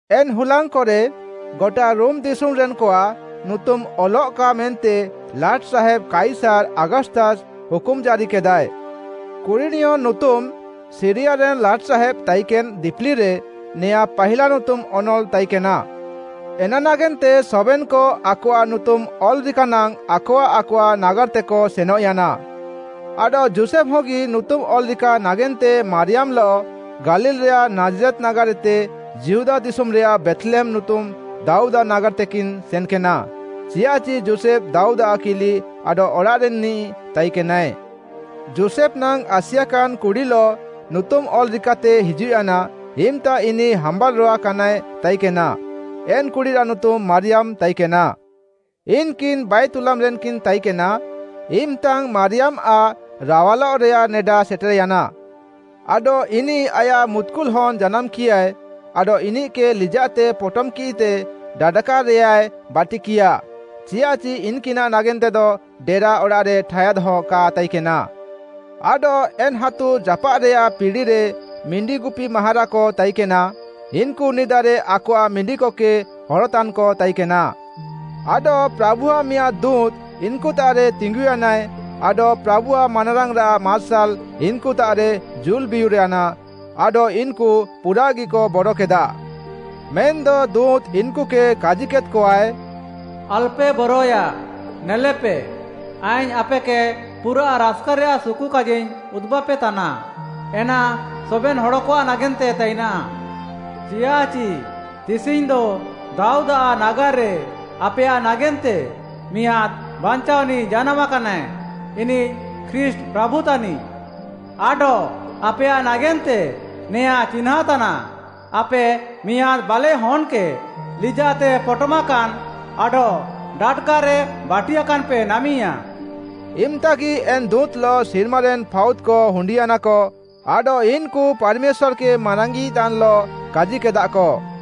ଏନ୍‌ ହୁଲାଙ୍ଗ୍‌କରେ ଗଟା ରୋମ୍‌ ଦିଶୁମ୍‌ରେନ୍‌କଆଃ ନୁତୁମ୍‌ ଅଲ୍‌ଲଃକା ମେନ୍ତେ ଲାଟ୍‌ସାହେବ୍‌ କାଇସାର୍‌ ଆଗସ୍ତସ୍‌ ହୁକୁମ୍‌ ଜାରିକେଦାଏ। କୁରିଣିୟ ନୁତୁମ୍‌ ସିରିୟାରେନ୍‌ ଲାଟ୍‌ସାହେବ୍‌ ତାଇକେନ୍‌ ଦିପିଲିରେ ନେଆଁଁ ପାହିଲା ନୁତୁମ୍‌ ଅନଲ୍‌ ତାଇକେନା। ଏନା ନାଗେନ୍ତେ ସବେନ୍‌କ ଆକଆଃ ନୁତୁମ୍‌ ଅଲ୍‌ରିକାନାଙ୍ଗ୍‌ ଆକଆଃ ଆକଆଃ ନାଗାର୍‌ତେକ ସେନଃୟାନା। ଆଡଃ ଯୋଷେଫ୍‌ହଗି ନୁତୁମ୍‌ ଅଲ୍‌ରିକା ନାଗେନ୍ତେ ମାରିୟାମ୍‌ଲଃ ଗାଲିଲ୍‌ରେୟାଃ ନାଜ୍‌ରେତ୍‌ ନାଗାର୍‌ଏତେ ଯିହୁଦା ଦିଶୁମ୍‌ରେୟାଃ ବେଥ୍‌ଲେହେମ୍‌ ନୁତୁମ୍‌ ଦାଉଦ୍‌ଆଃ ନାଗାର୍‌ତେକିନ୍ ସେନ୍‌କେନା, ଚିୟାଃଚି ଯୋଷେଫ୍‌ ଦାଉଦ୍‌ଆଃ କିଲି ଆଡଃ ଅଡ଼ାଃରେନ୍‌ନିଃ ତାଇକେନାଏ। ଯୋଷେଫ୍‌ ନାଙ୍ଗ୍‌ ଆସିଆକାନ୍‌ କୁଡ଼ିଲଃ ନୁତୁମ୍‌ ଅଲ୍‌ରିକାତେ ହିଜୁଃୟାନା, ଇମ୍‌ତା ଇନିଃ ହାମ୍ବାଲ୍‌ରୋୱା କାନାଏ ତାଇକେନା। ଏନ୍‌ କୁଡ଼ିରାଃ ନୁତୁମ୍‌ ମାରିୟାମ୍‌ ତାଇକେନା। ଇନ୍‌କିନ୍‌ ବାଏତୁଲାମ୍‌ ରେନ୍‌କିନ୍ ତାଇକେନା ଇମ୍‌ତାଙ୍ଗ୍‌ ମାରିୟାମ୍‌ଆଃ ରାୱାଲଃରେୟାଃ ନେଡା ସେଟେର୍‌ୟାନା। ଆଡଃ ଇନିଃ ଆୟାଃ ମୁତ୍‌କୁଲହନ୍‌ ଜାନାମ୍‌କିୟାଏ, ଆଡଃ ଇନିଃକେ ଲିଜାଃତେ ପୋଟମ୍‌କିଃତେ ଡାଡାକାରେୟାଏ ବାଟିକିୟାଃ, ଚିୟାଃଚି ଇନ୍‌କିନାଃ ନାଗେନ୍ତେଦ ଡେରା ଅଡ଼ାଃରେ ଠାୟାଦ୍‌ହ କା ତାଇକେନା। ଆଡଃ ଏନ୍‌ ହାତୁ ଜାପାଃରେୟାଃ ପିଡ଼ିରେ ମିଣ୍ଡିଗୁପିମାହାରାକ ତାଇକେନା, ଇନ୍‌କୁ ନିଦାରେ ଆକଆଃ ମିଣ୍ଡିକକେ ହରତାନ୍‌କ ତାଇକେନା। ଆଡଃ ପ୍ରାଭୁଆଃ ମିଆଁଦ୍‌ ଦୁଁତ୍‌ ଇନ୍‌କୁତାଃରେ ତିଙ୍ଗୁୟାନାଏ ଆଡଃ ପ୍ରାଭୁଆଃ ମାନାରାଙ୍ଗ୍‌ରାଃ ମାର୍ସାଲ୍‌ ଇନ୍‌କୁତାଃରେ ଜୁଲ୍‌ବିୟୁର୍‌ୟାନା ଆଡଃ ଇନ୍‌କୁ ପୁରାଃଗିକ ବରକେଦାଃ। ମେନ୍‌ଦ ଦୁଁତ୍‌ ଇନ୍‌କୁକେ କାଜିକେଦ୍‌କଆଏ, “ଆଲ୍‌ପେ ବରୟାଃ! ନେଲେପେ, ଆଇଙ୍ଗ୍‌ ଆପେକେ ପୁରାଃ ରାସ୍‌କାରେୟାଃ ସୁକୁକାଜିଙ୍ଗ୍‌ ଉଦୁବାପେତାନା, ଏନା ସବେନ୍‌ ହଡ଼କଆଃ ନାଗେନ୍ତେ ତାଇନାଃ। ଚିୟାଃଚି ତିସିଙ୍ଗ୍‌ଦ ଦାଉଦ୍‌ଆଃ ନାଗାର୍‌ରେ ଆପେୟାଃ ନାଗେନ୍ତେ ମିଆଁଦ୍‌ ବାଞ୍ଚାଅନିଃ ଜାନାମା କାନାଏ, ଇନିଃ ଖ୍ରୀଷ୍ଟ୍‌ ପ୍ରାଭୁ ତାନିଃ! ଆଡଃ ଆପେୟାଃ ନାଗେନ୍ତେ ନେଆଁଁ ଚିହ୍ନାଁ ତାନାଃ, ଆପେ ମିଆଁଦ୍‌ ବାଲେଃ ହନ୍‌କେ ଲିଜାଃତେ ପୋଟମାକାନ୍ ଆଡଃ ଡାଡାକାରେ ବାଟିୟାକାନ୍‌ପେ ନାମିୟା।” ଇମ୍‌ତାଗି ଏନ୍‌ ଦୁଁତ୍‌ଲଃ ସିର୍ମାରେନ୍‌ ଫାଉଦ୍‌କ ହୁଣ୍ଡିୟାନାକ ଆଡଃ ଇନ୍‌କୁ ପାର୍‌ମେଶ୍ୱାର୍‌କେ ମାରାଙ୍ଗ୍‌ଇତାନ୍‌ଲଃ କାଜିକେଦାଃକ: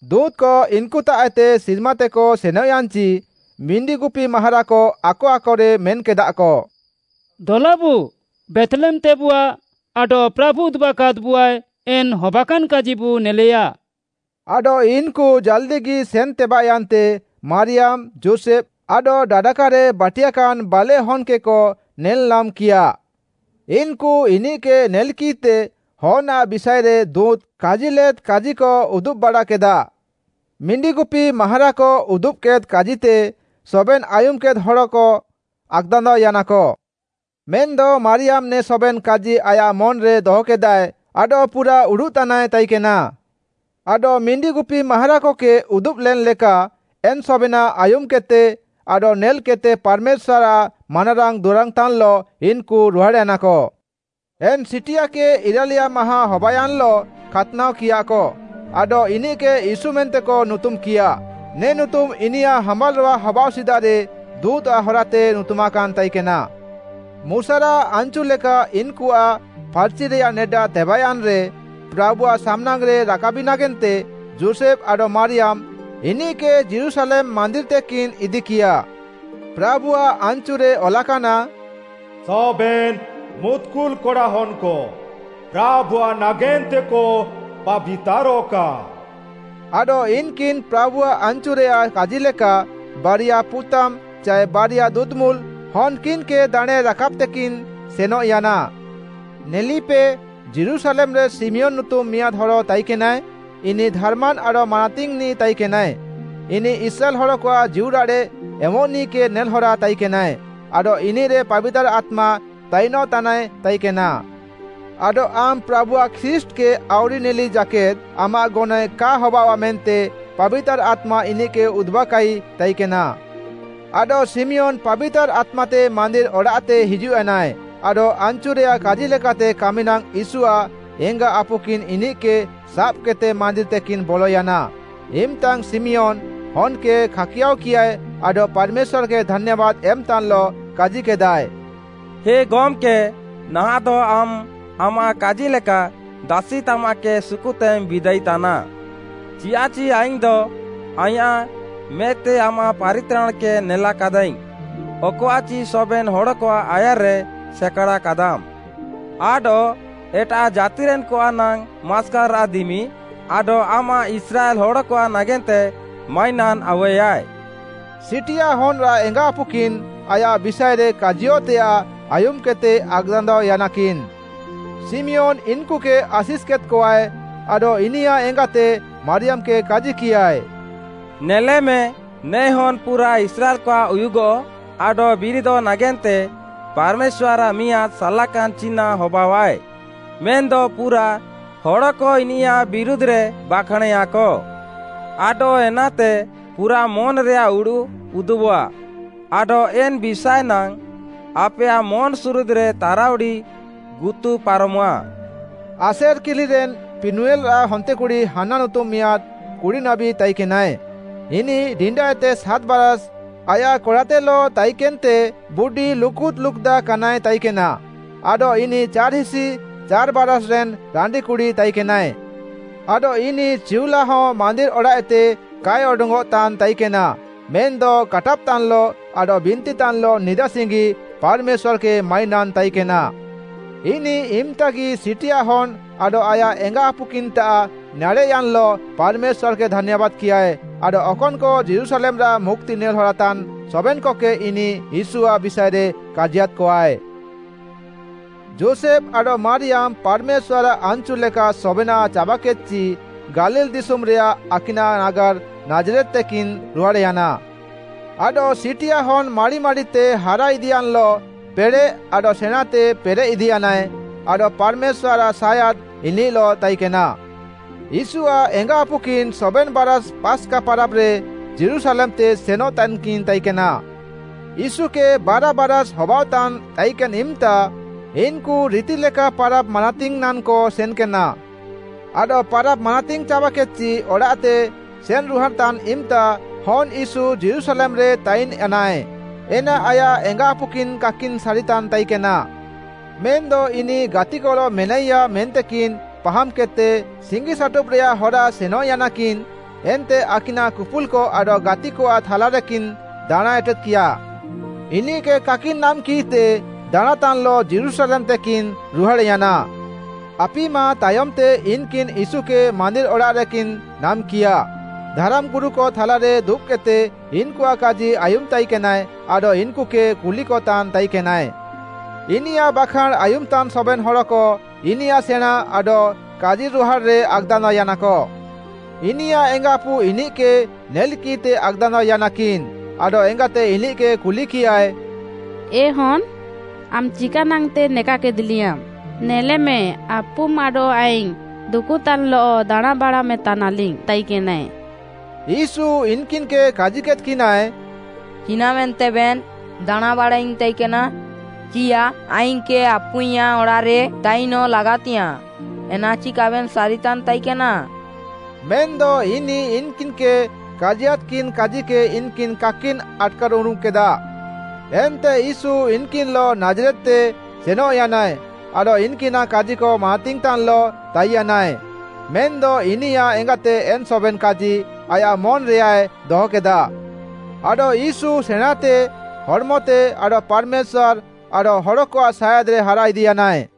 ଦୁଁତ୍‌କ ଇନ୍‌କୁତାଃଏତେ ସିର୍ମାତେକ ସେନଃୟାନ୍‌ଚି, ମିଣ୍ଡିଗୁପିମାହାରାକ ଆକ ଆକରେ ମେନ୍‌କେଦାଃକ, “ଦଲାବୁ ବେଥ୍‌ଲେହେମ୍‌ତେବୁଆ ଆଡଃ ପ୍ରାଭୁ ଉଦୁବାକାଦ୍‌ବୁଆଏ ଏନ୍‌ ହବାକାନ୍‌ କାଜିବୁ ନେଲେୟାଃ।” ଆଡଃ ଇନ୍‌କୁ ଜାଲ୍‌ଦିଗି ସେନ୍‌ତେବାଃୟାନ୍ତେ ମାରିୟାମ୍‌, ଯୋଷେଫ୍‌ ଆଡଃ ଡାଡାକାରେ ବାଟିୟାକାନ୍ ବାଲେଃ ହନ୍‌କେକ ନେଲ୍‌ନାମ୍‌କିୟାଃ। ଇନ୍‌କୁ ଇନିଃକେ ନେଲ୍‌କିଃତେ ହନ୍‌ଆଃ ବିଷାଏରେ ଦୁଁତ୍‌ କାଜିଲେଦ୍ କାଜିକ ଉଦୁବ୍‌ବାଡ଼ାକେଦାଃ। ମିଣ୍ଡିଗୁପିମାହାରାକ ଉଦୁବ୍‌କେଦ୍ କାଜିତେ ସବେନ୍‌ ଆୟୁମ୍‌କେଦ୍‌ ହଡ଼କ ଆକ୍‌ଦାନ୍ଦାଅୟାନାକ। ମେନ୍‌ଦ ମାରିୟାମ୍‌ ନେ ସବେନ୍‌ କାଜି ଆୟାଃ ମନ୍‌ରେ ଦହକେଦାଏ ଆଡଃ ପୁରାଃ ଉଡ଼ୁଃତାନାଏ ତାଇକେନା। ଆଡଃ ମିଣ୍ଡିଗୁପିମାହାରାକକେ ଉଦୁବ୍‌ଲେନ୍‌ଲେକା, ଏନ୍‌ ସବେନାଃ ଆୟୁମ୍‌କେଦ୍‌ତେ ଆଡଃ ନେଲ୍‌କେଦ୍‌ତେ ପାର୍‌ମେଶ୍ୱାର୍‌ଆଃ ମାନାରାଙ୍ଗ୍‌ ଦୁରାଙ୍ଗ୍‌ତାନ୍‌ଲଃ ଇନ୍‌କୁ ରୁହାଡ଼୍‌ୟାନାକ। ଏନ୍‌ ସିଟିଆକେ ଇରାଲିୟା ମାହାଁ ହବାୟାନ୍‌ଲଃ ଖାତ୍‌ନାଅକିୟାକ, ଆଡଃ ଇନିଃକେ ୟୀଶୁ ମେନ୍ତେକ ନୁତୁମ୍‌କିୟାଃ, ନେ ନୁତୁମ୍‌ ଇନିୟାଃ ହାମ୍ବାଲ୍‌ରୋୱା ହବାଅଃ ସିଦାରେ ଦୁଁତ୍‌ଆଃ ହରାତେ ନୁତୁମାକାନ୍‌ ତାଇକେନା। ମୁଶାରାଃ ଆନ୍‌ଚୁଲେକା ଇନ୍‌କୁଆଃ ଫାର୍‌ଚିରେୟାଃ ନେଡା ତେବାଃୟାନ୍‌ରେ, ପ୍ରାଭୁଆଃ ସାମ୍‌ନାଙ୍ଗ୍‌ରେ ରାକାବି ନାଗେନ୍ତେ ଯୋଷେଫ୍‌ ଆଡଃ ମାରିୟାମ୍‌ ଇନିଃକେ ଯୀରୁଶାଲେମ୍‌ ମାନ୍ଦିର୍‌ତେକିନ୍ ଇଦିକିୟାଃ। ପ୍ରାଭୁଆଃ ଆନ୍‌ଚୁରେ ଅଲାକାନା, “ସବେନ୍‌ ମୁତ୍‌କୁଲ୍‌ କଡ଼ାହନ୍‌କ ପ୍ରାଭୁଆଃ ନାଗେନ୍ତେକ ପାବିତାରଃକା,” ଆଡଃ ଇନ୍‌କିନ୍‌ ପ୍ରାଭୁଆଃ ଆନ୍‌ଚୁରେୟାଃ କାଜିଲେକା, ବାରିୟା ପୁତାମ୍ ଚାଏ ବାରିୟା ଦୁଦୁମୁଲ୍‌ ହନ୍‌କିନ୍‌କେ ଦାଣେଁ ରାକାବ୍‌ତେକିନ୍‌ ସେନଃୟାନା। ନେଲେପେ, ଯୀରୁଶାଲେମ୍‌ରେ ଶିମିୟନ୍‌ ନୁତୁମ୍‌ ମିଆଁଦ୍‌ ହଡ଼ ତାଇକେନାଏ, ଇନିଃ ଧାର୍‌ମାନ୍ ଆଡଃ ମାନାତିଙ୍ଗ୍‌ନିଃ ତାଇକେନାଏ। ଇନିଃ ଇସ୍ରାଏଲ୍‌ ହଡ଼କଆଃ ଜୀଉରାଡ଼େଃ ଏମଃନିଃକେ ନେଲ୍‌ହରା ତାଇକେନାଏ, ଆଡଃ ଇନିଃରେ ପାବିତାର୍‌ ଆତ୍ମା ତାଇନଃତାନାଏ ତାଇକେନା। ଆଡଃ ଆମ୍‌ ପ୍ରାଭୁଆଃ ଖ୍ରୀଷ୍ଟ୍‌କେ ଆଉରି ନେଲିଯାକେଦ୍ ଆମାଃ ଗନଏଃ କା ହବାଅଆଃ ମେନ୍ତେ ପାବିତାର୍‌ ଆତ୍ମା ଇନିଃକେ ଉଦୁବାକାଇ ତାଇକେନା। ଆଡଃ ଶିମିୟନ୍ ପାବିତାର୍‌ ଆତ୍ମାତେ ମାନ୍ଦିର୍‌ ଅଡ଼ାଃତେ ହିଜୁଃୟାନାଏ। ଆଡଃ ଆନ୍‌ଚୁରେୟାଃ କାଜିଲେକାତେ କାମିନାଙ୍ଗ୍‌ ୟୀଶୁଆଃ ଏଙ୍ଗା ଆପୁକିନ୍‌ ଇନିଃକେ ସାବ୍‌କେଦ୍‌ତେ ମାନ୍ଦିର୍‌ତେକିନ୍ ବଲୟାନା, ଇମ୍‌ତାଙ୍ଗ୍‌ ଶିମିୟନ୍‌, ହନ୍‌କେ ଖାକିୟାଅକିୟାଏ ଆଡଃ ପାର୍‌ମେଶ୍ୱାର୍‌କେ ଧାନ୍ୟାବାଦ୍‌ ଏମ୍‌ତାନ୍‌ଲଃ କାଜିକେଦାଏ: “ହେ ଗମ୍‌କେ, ନାହାଁଃଦ ଆମ୍‌ ଆମାଃ କାଜିଲେକା, ଦାସିତାମାଃକେ ସୁକୁତେମ୍ ବିଦାଇତାନା। ଚିୟାଃଚି ଆଇଙ୍ଗ୍‌ଦ ଆଇଁୟାଃ ମେଦ୍‌ତେ ଆମାଃ ପାରିତ୍ରାଣ୍‌କେ ନେଲାକାଦାଇଙ୍ଗ୍‌, ଅକଆଃଚି ସବେନ୍‌ ହଡ଼କଆଃ ଆୟାର୍‌ରେ ସେକାଡ଼ାକାଦାମ୍‌: ଆଡଃ ଏଟାଃ ଜାତିରେନ୍‌କଆଃ ନାଙ୍ଗ୍‌ ମାସ୍କାଲ୍‌ରାଃ ଦିମି ଆଡଃ ଆମାଃ ଇସ୍ରାଏଲ୍‌ ହଡ଼କଆଃ ନାଗେନ୍ତେ ମାଇନାନ୍‌ ଆଉୱେୟାଏ।” ସିଟିଆ ହନ୍‌ଆଃ ଏଙ୍ଗାଆପୁକିନ୍‌ ଆୟାଃ ବିଷାଏରେ କାଜିୟଃତେୟାଃ ଆୟୁମ୍‌କେଦ୍‌ତେ ଆକ୍‌ଦାନ୍ଦାଅୟାନାକିନ୍‌। ଶିମିୟନ୍‌ ଇନ୍‌କୁକେ ଆଶିଷ୍‌ କେଦ୍‌କଆଏ, ଆଡଃ ଇନିୟାଃ ଏଙ୍ଗାତେ ମାରିୟାମ୍‌କେ କାଜିକିୟାଏ, “ନେଲେମେ, ନେ ହନ୍‌ ପୁରାଃ ଇସ୍ରାଏଲ୍‌କଆଃ ଉୟୁଗଃ ଆଡଃ ବିରିଦଃ ନାଗେନ୍ତେ ପାର୍‌ମେଶ୍ୱାର୍‌ଆଃ ମିଆଁଦ୍‌ ସାଲାକାନ୍‌ ଚିହ୍ନାଁ ହବାଅଃଆଏ, ମେନ୍‌ଦ ପୁରାଃ ହଡ଼କ ଇନିୟାଃ ବିରୁଧ୍‌ରେ ବାଖାଁଣେୟାକ। ଆଡଃ ଏନାତେ ପୁରାଃ ମନ୍‌ରେୟାଃ ଉଡ଼ୁଃ ଉଦୁବଃଆ। ଆଡଃ ଏନ୍‌ ବିଷାଏନାଙ୍ଗ୍‌ ଆପେୟାଃ ମନ୍‌ସୁରୁଦ୍‌ରେ ତାରାଉଡ଼ି ଗୁତୁ ପାରମଃଆ।” ଆସେର୍‌ କିଲିରେନ୍ ପିନୁଏଲ୍‌ଆଃ ହନ୍ତେକୁଡ଼ି ହାନ୍ନା ନୁତୁମ୍‌ ମିଆଁଦ୍‌ କୁଡ଼ିନାବୀ ତାଇକେନାଏ। ଇନିଃ ଡିଣ୍ଡାଏତେ ସାତ୍ ବାରାଷ୍ ଆୟାଃ କଡ଼ାତେଲଃ ତାଇକେନ୍‌ତେ ବୁଡି ଲୁକୁଦ୍‌ ଲୁକୁଦା କାନାଏ ତାଇକେନା। ଆଡଃ ଇନିଃ ଚାର୍‌ହିସି ଚାର୍‌ବାରାଷ୍‌ ରେନ୍‌ ରାଣ୍ଡିକୁଡ଼ି ତାଇକେନାଏ। ଆଡଃ ଇନିଃ ଚିଉଲାହ ମାନ୍ଦିର୍‌ ଅଡ଼ାଃଏତେ କାଏ ଅଡଙ୍ଗ୍‌ଅଃତାନ୍‌ ତାଇକେନା, ମେନ୍‌ଦ କାଟାବ୍‌ତାନ୍‌ଲଃ ଆଡଃ ବିନ୍ତିତାନ୍‌ଲଃ ନିଦାସିଙ୍ଗି ପାର୍‌ମେଶ୍ୱାର୍‌କେ ମାଇନାନ୍‌ ତାଇକେନା। ଇନିଃ ଇମ୍‌ତାଙ୍ଗ୍‌ଗି ସିଟିଆ ହନ୍‌ ଆଡଃ ଆୟାଃ ଏଙ୍ଗାଆପୁକିନ୍‌ତାଃ ନାଡ଼େଃୟାନ୍‌ଲଃ ପାର୍‌ମେଶ୍ୱାର୍‌କେ ଧାନ୍ୟାବାଦ୍‌କିୟାଏ ଆଡଃ ଅକନ୍‌କ ଯୀରୁଶାଲେମ୍‌ରାଃ ମୁକ୍ତି ନେଲ୍‌ହରାତାନ୍ ସବେନ୍‌କକେ ଇନିଃ ୟୀଶୁଆଃ ବିଷାଏରେ କାଜିୟାଦ୍‌କଆଏ। ଯୋଷେଫ୍‌ ଆଡଃ ମାରିୟାମ୍‌ ପାର୍‌ମେଶ୍ୱାର୍‌ଆଃ ଆନ୍‌ଚୁଲେକା ସବେନାଃ ଚାବାକେଦ୍‌ଚି ଗାଲିଲ୍‌ ଦିଶୁମ୍‌ରେୟାଃ ଆକିନାଃ ନାଗାର୍‌ ନାଜ୍‌ରେତ୍‌ତେକିନ୍ ରୁହାଡ଼୍‌ୟାନା। ଆଡଃ ସିଟିଆ ହନ୍‌ ମାଡ଼ି ମାଡ଼ିତେ ହାରା ଇଦିୟାନ୍‌ଲଃ ପେଡ଼େଃ ଆଡଃ ସେଣାଁଁତେ ପେରେଃଇଦିୟାନାଏ, ଆଡଃ ପାର୍‌ମେଶ୍ୱାର୍‌ଆଃ ସାୟାଦ୍ ଇନିଃଲଃ ତାଇକେନା। ୟୀଶୁଆଃ ଏଙ୍ଗାଆପୁକିନ୍ ସବେନ୍‌ ବାରାଷ୍ ପାସ୍‌କା ପାରାବ୍‌ରେ ଯୀରୁଶାଲେମ୍‌ତେ ସେନଃ ତାନ୍‌କିନ୍ ତାଇକେନା। ୟୀଶୁକେ ବାରା ବାରାଷ୍ ହବାଅଃତାନ୍ ତାଇକେନ୍‌ ଇମ୍‌ତା, ଇନ୍‌କୁ ରିତିଲେକା ପାରାବ୍‌ ମାନାତିଙ୍ଗ୍‌ ନାଙ୍ଗ୍‌କ ସେନ୍‌କେନା। ଆଡଃ ପାରାବ୍‌ ମାନାତିଙ୍ଗ୍‌ ଚାବାକେଦ୍‌ଚି, ଅଡ଼ାଃତେ ସେନ୍ ରୁହାଡ଼୍‌ତାନ୍ ଇମ୍‌ତା ହନ୍‌ ୟୀଶୁ ଯୀରୁଶାଲେମ୍‌ରେ ତାଇନ୍‌ୟାନାଏ, ଏନା ଆୟାଃ ଏଙ୍ଗାଆପୁକିନ୍ କାକିନ୍ ସାରିତାନ୍ ତାଇକେନା। ମେନ୍‌ଦ ଇନିଃ ଗାତିକଲଃ ମେନାଇୟାଃ ମେନ୍ତେକିନ୍ ପାହାମ୍‌କେଦ୍‌ତେ, ସିଙ୍ଗିସାଟୁବ୍‌ରେୟାଃ ହରା ସେନଃୟାନାକିନ୍‌, ଏନ୍ତେ ଆକିନାଃ କୁପୁଲ୍‌କ ଆଡଃ ଗାତିକଆଃ ଥାଲାରେକିନ୍ ଦାଣାଁଁଏଟେଦ୍‌କିୟାଃ। ଇନିଃକେ କାକିନ୍ ନାମ୍‌କିଃତେ ଦାଣାଁଁତାନ୍‌ଲଃ ଯୀରୁଶାଲେମ୍‌ତେକିନ୍ ରୁହାଡ଼୍‌ୟାନା। ଆପି ମାଃ ତାୟମ୍‌ତେ ଇନ୍‌କିନ୍‌ ୟୀଶୁକେ ମାନ୍ଦିର୍‌ଅଡ଼ାଃରେକିନ୍ ନାମ୍‌କିୟାଃ, ଧାରାମ୍‌ଗୁରୁକ ଥାଲାରେ ଦୁବ୍‌କେଦ୍‌ତେ ଇନ୍‌କୁଆଃ କାଜି ଆୟୁମ୍‌ତାଇକେନାଏ ଆଡଃ ଇନ୍‌କୁକେ କୁଲିକତାନ୍ ତାଇକେନାଏ। ଇନିୟାଃ ବାଖାଁଣ୍‌ ଆୟୁମ୍‌ତାନ୍ ସବେନ୍‌ ହଡ଼କ ଇନିୟାଃ ସେଣାଁଁ ଆଡଃ କାଜିରୁହାଡ଼୍‌ରେ ଆକ୍‌ଦାନ୍ଦାଅୟାନାକ। ଇନିୟାଃ ଏଙ୍ଗାଆପୁ ଇନିଃକେ ନେଲ୍‌କିଃତେ ଆକ୍‌ଦାନ୍ଦାଅୟାନାକିନ୍‌, ଆଡଃ ଏଙ୍ଗାତେ ଇନିଃକେ କୁଲିକିୟାଏ, “ଏ ହନ୍‌, ଆମ୍‌ ଚିକାନାଙ୍ଗ୍‌ତେ ନେକାକେଦ୍‌ଲିୟାଁମ୍‌? ନେଲେମେ, ଆପୁମ୍ ଆଡଃ ଆଇଙ୍ଗ୍‌ ଦୁକୁତାନ୍‌ଲଃ ଦାଣାଁଁବାଡ଼ାମେଁ ତାନାଲିଙ୍ଗ୍‌ ତାଇକେନା।” ୟୀଶୁ ଇନ୍‌କିନ୍‌କେ କାଜିକେଦ୍‌କିନାଏ, “ଚିନାଃମେନ୍ତେବେନ୍ ଦାଣାଁଁବାଡ଼ାଇଙ୍ଗ୍‌ ତାଇକେନା? ଚିୟାଃ ଆଇଙ୍ଗ୍‌କେ ଆପୁଇଁୟାଃ ଅଡ଼ାଃରେ ତାଇନଃ ଲାଗାତିଙ୍ଗ୍‌ୟାଁଃ ଏନାଚି କାବେନ୍ ସାରିତାନ୍ ତାଇକେନା?” ମେନ୍‌ଦ ଇନିଃ ଇନ୍‌କିନ୍‌କେ କାଜିୟାଦ୍‌କିନ୍ କାଜିକେ ଇନ୍‌କିନ୍‌ କାକିନ୍ ଆଟ୍‌କାର୍‌ଉରୁମ୍‌କେଦାଃ। ଏନ୍ତେ ୟୀଶୁ ଇନ୍‌କିନ୍‌ଲଃ ନାଜ୍‌ରେତ୍‌ତେ ସେନଃୟାନାଏ, ଆଡଃ ଇନ୍‌କିନାଃ କାଜିକ ମାନାତିଙ୍ଗ୍‌ତାନ୍‌ଲଃ ତାଇୟାନାଏ। ମେନ୍‌ଦ ଇନିୟାଃ ଏଙ୍ଗାତେ ଏନ୍‌ ସବେନ୍‌ କାଜି ଆୟାଃ ମନ୍‌ରେୟାଏ ଦହକେଦା। ଆଡଃ ୟୀଶୁ ସେଣାଁଁତେ, ହଡ଼୍‌ମତେ ଆଡଃ ପାର୍‌ମେଶ୍ୱାର୍‌ ଆଡଃ ହଡ଼କଆଃ ସାୟାଦ୍‌ରେ ହାରା ଇଦିୟାନାଏ।